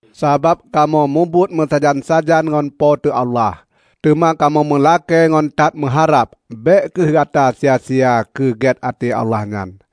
Sabab kamoe mubuet meusajan-sajan ngon Po teu Allah, teuma kamoe meulakée ngon that meuharab bék kheueh gata sia-sia keugét até Allah nyan.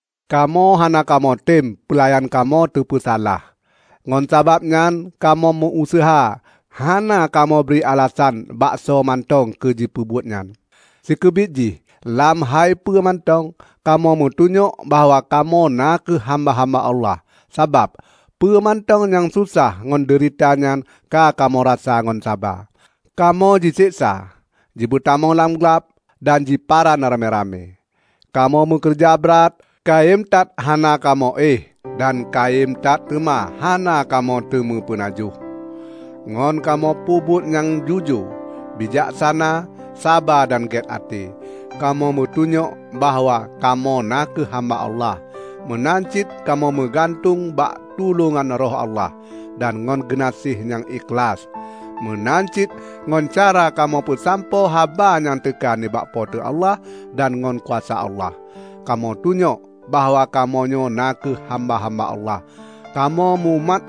Kamoe hana kamoe tem peulayan kamoe teupeusalah. Ngon sabab nyan kamoe meu-useuha hana kamoe bri alasan baksoe mantong keu jipeubuet nyan. Sikeubiet jih, lam hai peue mantong, kamoe meutunyok bahwa kamoe na kheueh hamba-hamba Allah. Sabab, peue mantong nyang susah ngon deurita nyan ka kamoe rasa ngon saba: Kamoe jiseksa, jipeutamong lam glab, dan jiparan ramé-ramé; kamoe meukeureuja brat, kayém that hana kamoe éh dan kayém that teuma hana kamoe teumé peunajoh. Ngon kamoe peubuet nyang jujoe, bijaksana, saba dan gét até, kamoe meutunyok bahwa kamoe na kheueh hamba Allah. Meunan cit kamoe meugantung bak tulôngan Roh Allah, dan ngon geunaséh nyang ikhlaih, meunan cit ngon cara kamoe peusampoe haba nyang teuka nibak Po teu Allah dan ngon kuasa Allah, kamoe tunyok bahwa kamoe nyoe na kheueh hamba-hamba Allah. Kamoe mumat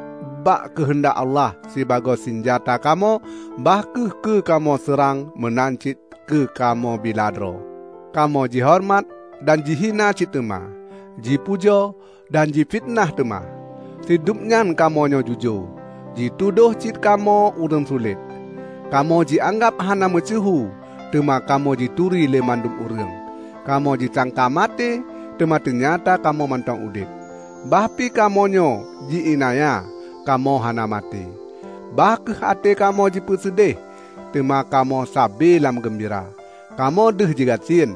bak keuheundak Allah sibagoe sinjata kamoe bah kheueh keu kamoe seurang meunan cit keu kamoe bila droe. Kamoe jihoreumat, dan jihina cit teuma; jipujoe, dan jifiteunah teuma. Sidub nyan kamoe nyoe jujoe, jitudôh cit kamoe ureuëng sulet. Kamoe jianggab hana meusyeuhu, teuma kamoe jituri lé mandum ureuëng. Kamoe jisangka maté, teuma teunyata kamoe mantong udeb. Bah pi kamoe nyoe ji iénanya, kamoe hana maté. Bah kheueh até kamoe jipeuseudeh, teuma kamoe sabe lam geumbira. Kamoe deuh jih gasien,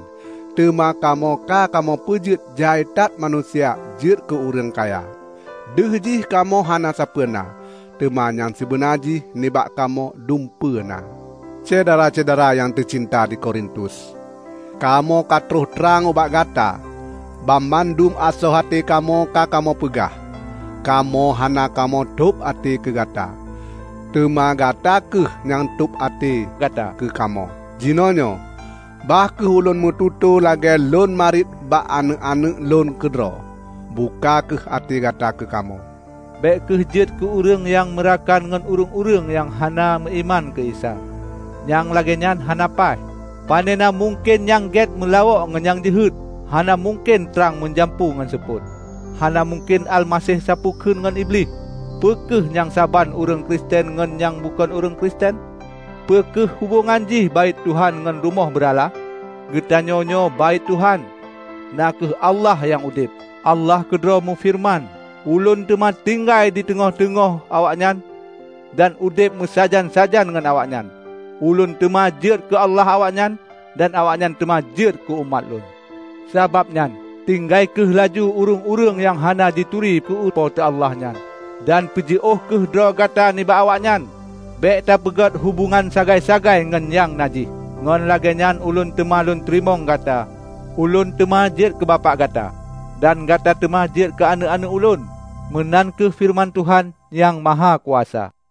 teuma kamoe ka kamoe peujeuet jai that manusia jeuet keu ureuëng kaya. Deuh jih kamoe hana sapeue na, teuma nyang sibeuna jih nibak kamoe dumpeue na. Syedara-syedara nyang teucinta di Korintus! Kamoe ka troh trang ubak gata, banmandum asoe até kamoe ka kamoe peugah. Kamoe hana kamoe tôb até keu gata, teuma gata kheueh nyang tôb até gata keu kamoe. Jinoenyoe, bah kheueh ulôn meututoe lagée lôn mariet bak aneuëk-aneuëk lon keudroe. Buka kheueh até gata keukamoe. Bék kheueh jeuet keu ureuëng nyang meurakan ngon ureuëng-ureuëng nyang hana meuiman keu Isa; nyang lagée nyan hana paih. Panena mungken nyang gét meulawok ngon nyang jeuhet! Hana mungken trang meujampu ngon supot. Hana mungken Almaseh sapeue kheun ngon Iblih. Peu kheueh nyang saban ureuëng Kristen ngon nyang bukon ureuëng Kristen? Peu kheueh hubongan jih Baét Tuhan ngon rumoh beurala? Geutanyoe nyoe Baét Tuhan, na kheueh Allah nyang udeb. Allah keudroe meufeureuman, "Ulôn teuma tinggai diteungoh-teungoh awaknyan, dan udeb meusajan-sajan ngon awaknyan. Ulôn teuma jeuet keu Allah awaknyan, dan awaknyan teuma jeuet keu umat Lôn. Sabab nyan, tinggai kheueh laju ureuëng-ureuëng nyang hana jituri keu Po teu Allah nyan, dan peujiôh kheueh droe gata nibak awaknyan. Bék tapeugot hubongan sagai-sagai ngon nyang najih, ngon lagée nyan Ulôn teuma kuteurimong gata. Ulôn teuma jeuet keu Bapak gata, dan gata teuma jeuet keu aneuëk-aneuëk Ulôn, meunan kheueh feureuman Tuhan Nyang Mahakuasa."